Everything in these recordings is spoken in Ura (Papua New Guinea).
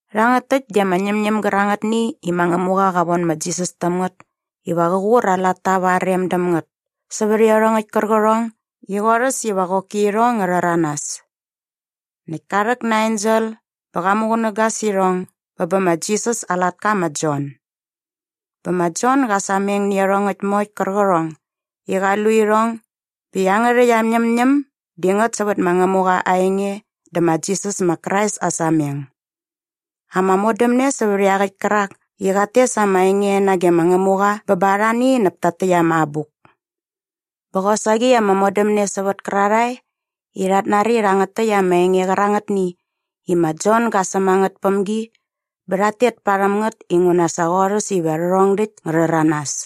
Rhangät täkt di ama ñämñäm gärangätni i ma Ngämuqa qa von ma Jisas täm ngät iva qä qur aa latta va aa rem däm ngät sävät iarhongäkt kärqärhong i qorhäs iva qoki irhong ngä rhäranas. Näkt ka rhäk na aa ensel bä qa muqunäga sä irhong bä bä ma Jisas aa latka ma Jon. Bä ma Jon ga sameng nä iarhongäkt moe qärqärhong i qa lu irhong bä iangärhäkt aa ñämñäm di ngät sävät ma Ngämuqa aa enge dä ma Jisas ma Krais aa sameng. Ama modämne sävät iaqäkt kärak i qat tes ama enge nage ma Ngämuqa bä ba arhani näp takt täkt ama abuk. Bä qosaqi ama modämne sävät kärarhae i rhat nari rhangät täkt ama enge qärangätni i ma Jon ga säm a ngät päm gi bä rhat tet parhäm ngät inguna sa qorhäs iva rhärhong däkt ngä rhäranas.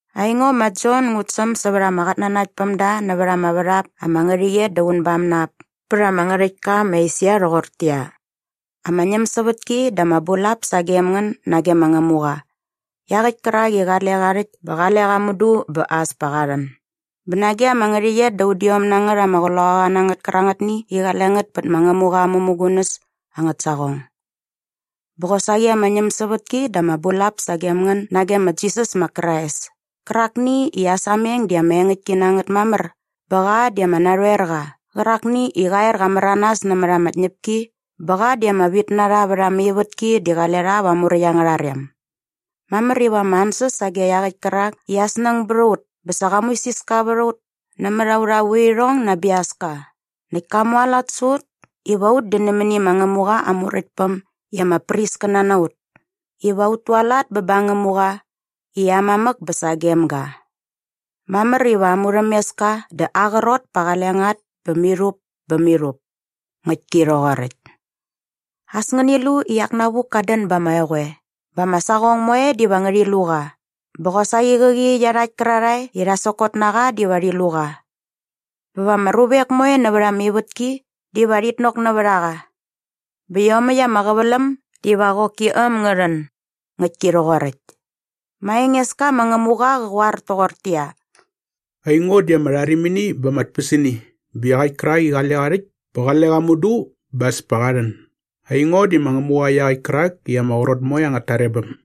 Aingo ma Jon ngut säm sävät ama qatnanaktpämda nämät ama värhap ama ngärhäqyet da unbam na ap pät ama ngärhäktka ma Esia rhoqortäqyia, ama ñämsävätki dä ama bulap sagem ngän nage ma Ngämuqa iaqäkt kärak i qale qa rhäkt bä qale qa mudu bä as pa qa rhän bä nage ama ngärhäqyet da udiom na ngät ama qloqaqanangät kärangätni i qale ngät pät ma Ngämuqa aa mämugunäs angät saqong. Bä qosaqi ama ñämsävätki dä ama bulap sagem ngän nage ma Jisas ma Krais kärakni i aa sameng di ama engäktki na ngät mamär bä qa di ama narhoerqa qärakni i qa er qa märanas nämät ama tñäpki bä qa di ama vitnarha vät ama ivätki di qale rha va aa muräkt angärha rem. Mamär iva ama ansäs sage iaqäkt kärak i aa snäng bät a ut bä sa qa muisiska vät a ut nämät aurha vuirhong na aa biaska näkt ka mualat sä ut iva ut di nämäni ma Ngämuqa aa Muräktpäm i ama priskäna na ut iva ut tualat bä ba aa Ngämuqa i aa mamäk bä sagem ga. Mamär iva aa murhämeska dä aa qrot pa qale ngät bä mirhup bä mirhup. Ngäktki rhoqoräkt. As ngäni lu i iak navuk kat dän ba ama eqoe bä ama saqong moe diva ngärhi lu qa bä qosaqi qäqi iarhakt kärarhae i rha sokot na qa diva rhi lu qa. Ba va ama ruvek moe nävät ama ivätki diva rhit nok nävät a qa. Bä iomäkt ama qäväläm diva qoki äm ngä rhän. Ngäktki rhoqoräkt. Ma Engeska ma Ngämuqa qä qoar toqortäqyia, “Aingo di ama rharimini bä ama tpäsini bä iaqäkt kärak i qale qa rhäkt bä qale qa mudu bä as pa qa rhän. Aingo di ma Ngämuqa iaqäkt kärak i ama qrot moe angät tarebäm.”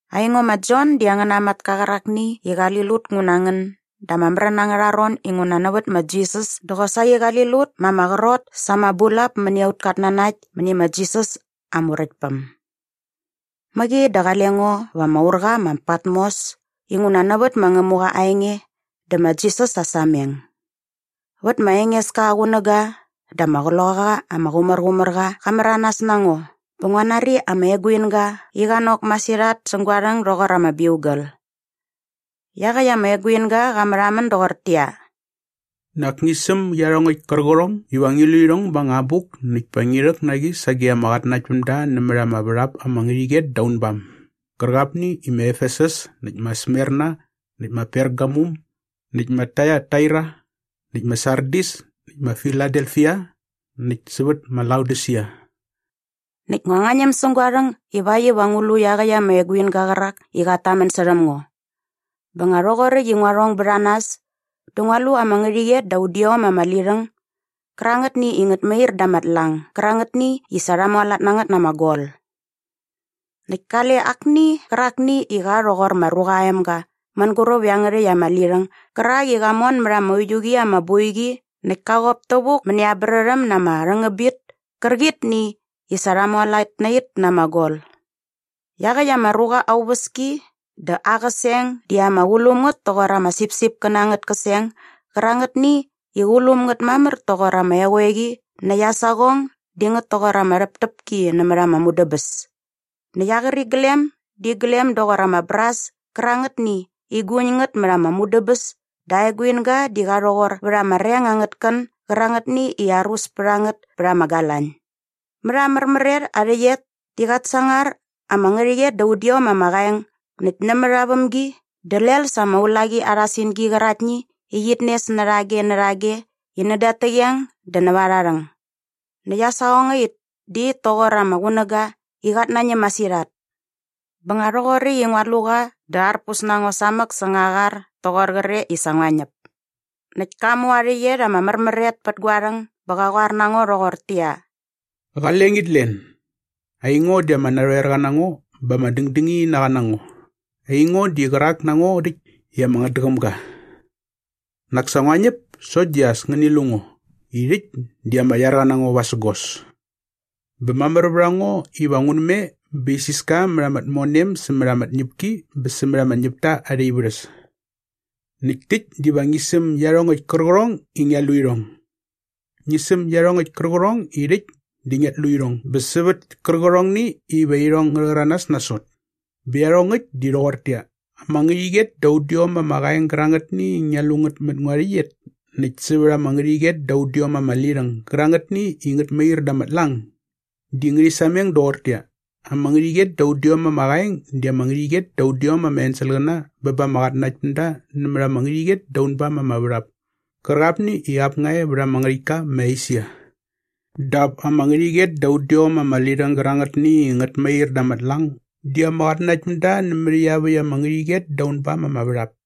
Aingo ma Jon di angäna matka qärakni i qali lut ngu na ngän da ama märän angärha ron inguna nävät ma Jisas dä qosaqi qali lut ma ama qrot sa ama bulap mäni aut katnanakt mäni ma Jisas aa Muräktpäm. Mäqi dä qale ngo va ama urqa ma Patmos inguna nävät ma Ngämuqa aa enge dä ma Jisas aa sameng. Vät ma Engeska aa qunäga dä ama Qloqaqa ama Qumärqumärqa qa märanas na ngo bä ngua nari ama eguinga i qa nok masirhat säng gua rhäng doqor ama biugal. Iaqäkt ama eguinga qa märhamän doqortäqyia, “Nak ngi säm iarhongäkt gärqärhong iva ngi lu irhong ba anga abuk näkt pa ngi rhäk na qi sage ama qatnanaktpämda nämät ama värhap ama ngärhäqyet da unbam gärqapni i ma Efesus näkt ma Smerna näkt ma Pergamum näkt ma Taiataira näkt ma Sardis näkt ma Filadefia näkt sävät ma Laodisia.” Näkt ngua ñäm säng gua rhäng ivakt iva ngu lu iaqäkt ama eguinga qärak i qat tamän särhäm ngo. Bä nga rhoqoräkt i ngua rhong bät a nas dä ngua lu ama ngärhäqyet da udiom ama lirhäng gärangätni i ngät mair da ama tlang gärangätni i sa rha mualat na ngät na ama gol. Näkt kale akni qärakni i qa rhoqor ma Ruqa aa Emga mänguräp iangärhäkt ama lirhäng gärak i qa mon mät ama uiu qi ama boiqi näkt ka qop tävuk mäni aa brärhäm na ama rhängäbit kärqitni i sa rha mualat na it na ama gol. Iaqäkt ama ruqa aa uväski dä aa qäseng di ama qulum ngät toqor ama sipsipkäna angät käseng gärangätni i qulum ngät mamär toqor ama eqoeqi näkt aa saqong di ngät toqor ama rhäptäpki nämät ama mudäbäs. Näkt aa qäriglem di iglem doqor ama bras kärangätni i guñ ngät mät ama mudäbäs dä aa eguinga di qa rhoqor vät ama reng angät kän gärangätni i arus pät a ngät pät ama galañ. Mät aa märmär et aa rhäqyet di qat sangar ama ngärhäqyet da udiom ama qaeng näkt nämät aa vämgi dä lel sa ama ulaqi arha singi qäraktni i qit nes närhage närhage i näda at täqeng dä näva arha rhäng. Näkt aa saqongait di it toqor ama qunäga i qat nañäm masirhat. Bä nga rhoqoräkt i ngua lu qa dä arpus na ngo samäk säng aa qar toqor qre i sa ngua ñäp. Näkt ka mu aa rhäqyet ama märmär et pät gua rhäng bä qa qoar na ngo rhoqortäqyia, “Qale ngit len. Aingo di ama narhoerqa na ngo bä ama dängdängininaqa na ngo. Aingo di qärak na ngo rhäkt i ama ngätdäqäm ga. Nak sa ngua ñäp sokt di as ngäni lu ngo i rhäkt di ama iarqa na ngo vasägos. Bä mamär vät a ngo iva ngun me bä isiska mät ama tmonem sämät ama tñäpki bä sämät ama ñäpta arha ivärhäs. Näkt täkt diva ngi säm iarhongäkt kärqärhong i ngia lu irhong. Ngi säm iarhongäkt kärqärhong i rhäkt di ngiat lu irhong bä sävät kärqärhongni iva irhong ngä rhäranas nasot. Bä iarhongäkt di rhoqortäqyia, ama ngärhäqyet da udiom ama qaeng gärangätni i ngia lu ngät mät ngua rhäqyet näkt sävät ama ngärhäqyet da udiom ama lirhäng gärangätni i ngät mair da ama tlang di ngärhi sameng doqortäqyia, ama ngärhäqyet da udiom ama qaeng di ama ngärhäqyet da udiom ama enselqäna bä ba ama qatnanaktpämda nämät ama ngärhäqyet da unbam ama värhap kärqapni i ap nga e vät ama ngärhäktka ma Esia. Dap ama ngärhäqyet da udiom ama lirhäng gärangätni i ngät mair da ama tlang di ama qatnanaktpämda nämät iaväkt ama ngärhäqyet dä unbam ama värhap.”